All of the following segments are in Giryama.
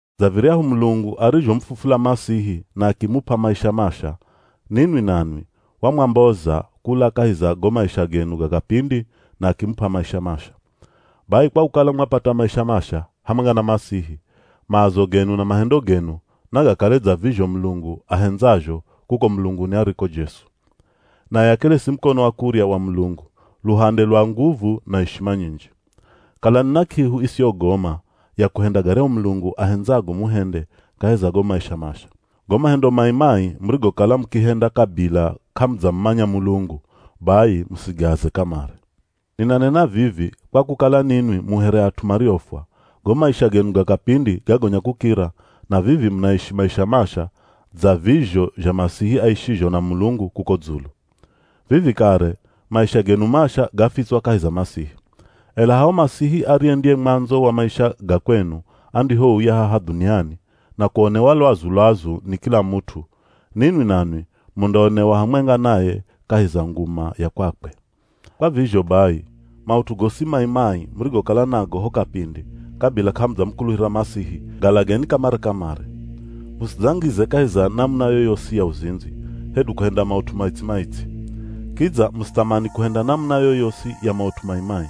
Dza viryahu Mulungu arizhomufufula Masihi na akimup'a maisha masha, ninwi nanwi, wamwamboza kula kahi za go maisha genu ga kapindi na akimup'a maisha masha. Bai kwa kukala mwapata maisha masha hamwenga na Masihi, maazo genu na mahendo genu nagakale dza vizho Mulungu ahendzazho kuko mulunguni ariko Jesu. Naye akeresi mukono wa kurya wa Mulungu, luhande lwa nguvu na ishima nyinji. Kalani na k'ihu isiyogoma ya kuhenda garyahu Mulungu ahendzago muhende kahi za go maisha masha. Go mahendo mai-mai murigokala mukihenda kabila k'amudzamumanya Mulungu, bai musigaaze kamare. Ninanena vivi kwa kukala ninwi mu here at'u mariofwa, go maisha genu ga kapindi gagonya kukira na vivi munaishi maisha masha dza vizho zha Masihi aishizho na Mulungu kuko dzulu. Vivi kare maisha genu masha gafitswa kahi za Masihi. Ela haho Masihi ariye ndiye mwandzo wa maisha ga kwenu andihouya haha dhuniani na kuonewa lwazu-lwazu ni kila mut'u, ninwi nanwi mundaonewa hamwenga naye kahi za nguma ya kwakwe. Kwa vizho bai, maut'u gosi mai-mai murigokala nago ho kapindi kabila k'amudzamukuluhira Masihi, galageni kamare-kamare. Musidzangize kahi za namuna yoyosi ya uzindzi, hedu kuhenda maut'u maitsi-maitsi. Kidza musithamani kuhenda namuna yoyosi ya maut'u mai-mai.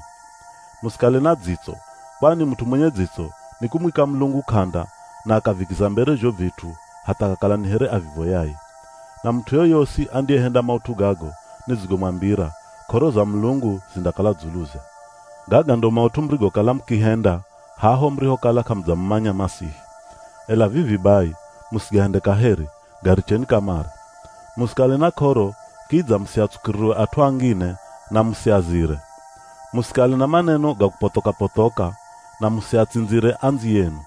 Musikale na dzitso, kwani mut'u mwenye dzitso ni kumwika Mulungu k'anda na akavikiza mbere zho vit'u hatha akakala ni here avivoyaye. Na mut'u yoyosi andiyehenda maut'u gago nidzigomwambira k'oro za Mulungu zindakala dzuluze. Gaga ndo maut'u murigokala mukihenda haho murihokala k'amudzamumanya Masihi. Ela vivi bai musigahende kaheri, garicheni kamare. Musikale na k'oro kidza musiatsukirirwe at'u angine na musiazire. Musikale na maneno ga kupothoka-pothoka, na musiatsindzire andziyenu.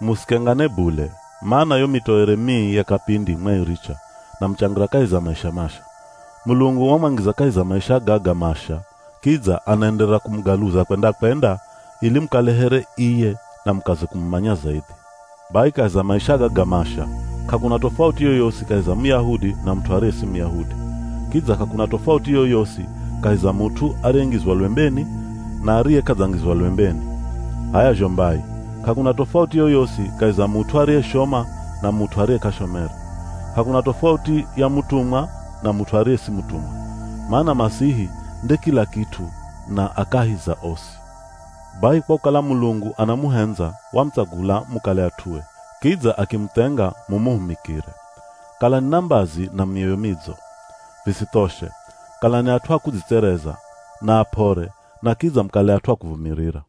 Musikengane bule, mana yo mitoere mii ya kapindi mwairicha, na muchangira kahi za maisha masha. Mulungu wamwangiza kahi za maisha gaga masha, kidza anaenderera kumugaluza kwenda-kwenda ili mukale here iye na mukaze kumumanya zaidhi. Bai kahi za maisha gaga masha, k'akuna tofauti yoyosi kahi za Muyahudi na mut'u ariye si Muyahudi. Kidza k'akuna tofauti yoyosi kahi za mut'u ariyengizwa lwembeni na ariye k'adzangizwa lwembeni. H'aya zho mbai, k'akuna tofauti yoyosi kahi za mut'u ariyeshoma na mut'u ariye k'ashomere. K'akuna tofauti ya mutumwa na mut'u ariye si mutumwa. Mana Masihi nde kila kit'u na a kahi za osi. Bai kwa kukala Mulungu anamuhendza wamutsagula mukale at'ue, kidza akimuthenga mumuhumikire. Kalani na mbazi na mioyo midzo. Visithoshe, kalani at'u a kudzitsereza, na ap'ore na kidza mukale at'u akuvumirira.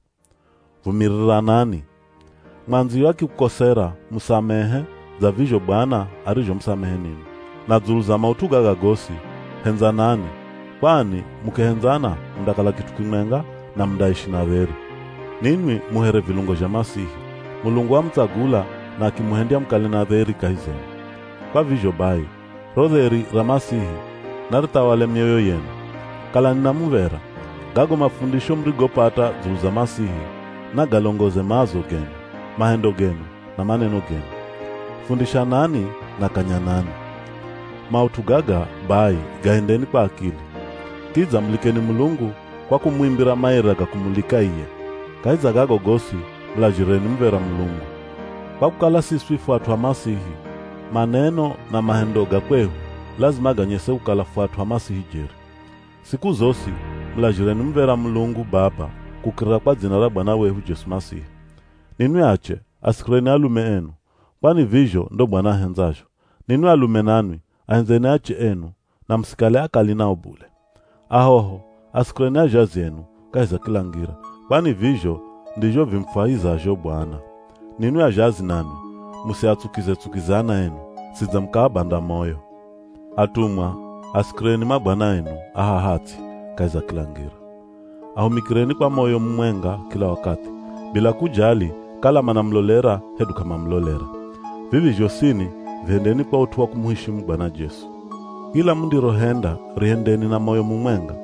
Vumiriranani. Mwandziyo akikukosera, musamehe dza vizho Bwana arizhomusamehe ninwi. Na dzulu za maut'u gaga gosi, hendzanani, kwani mukihendzana mundakala kit'u kimwenga na mundaishi na dheri. Ninwi mu here vilungo zha Masihi, Mulungu wamutsagula na akimuhendya mukale na dheri kahi zenu. Kwa vizho bai ro dheri ra Masihi narithawale mioyo yenu. Kalani na muv̱era. Gago mafundisho murigopata dzulu za Masihi, nagalongoze maazo genu, mahendo genu na maneno genu. Fundishanani na kanyanani. Maut'u gaga bai gahendeni kwa akili. Kidza mulikeni Mulungu kwa kumuimbira maira ga kumulika iye. Kahi za gago gosi, mulazhireni muv̱era Mulungu. Kwa kukala siswi fu at'u a Masihi, maneno na mahendo ga kwehu lazima ganyese kukala fu at'u a Masihi jeri. Siku zosi mulazhireni muv̱era Mulungu Baba kukirira kwa dzina ra Bwana wehu Jesu Masihi. Ninwi ache asikireni alume enu, kwani vizho ndo Bwana ahendzazho. Ninwi alume nanwi ahendzeni ache enu na musikale akali nao bule. Ahoho, asikireni azhazi enu kahi za kila ngira, kwani vizho ndizho vimufwahizazho Bwana. Ninwi azhazi nanwi, musiatsukize-tsukize ana enu, sidze mukaabanda moyo. Atumwa, asikireni mabwana enu a haha ts'i kahi za kila ngira. Ahumikireni kwa moyo mumwenga kila wakathi, bila kujali kala manamulolera hedu k'amamulolera. Vivi zhosini vihendeni kwa ut'u wa kumuheshimu Bwana Jesu. Kila mundirohenda rihendeni na moyo mumwenga,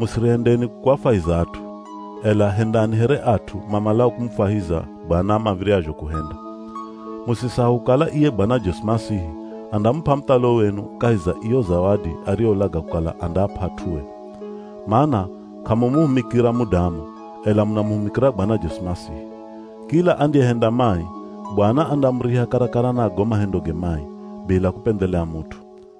musirihendeni kuafwahiza at'u, ela hendani here at'u mamalao kumufwahiza Bwana mav̱iryazho kuhenda. Musisahau kukala iye Bwana Jesu Masihi andamup'a muthalo wenu kahi za iyo zawadi ariyolaga kukala andaap'a at'ue. Mana k'amumuhumikira mudamu, ela munahumikira Bwana Jesu Masihi. Kila andiyehenda mai, Bwana andamuriha karakara na go mahendoge mai, bila kupendhelea mut'u.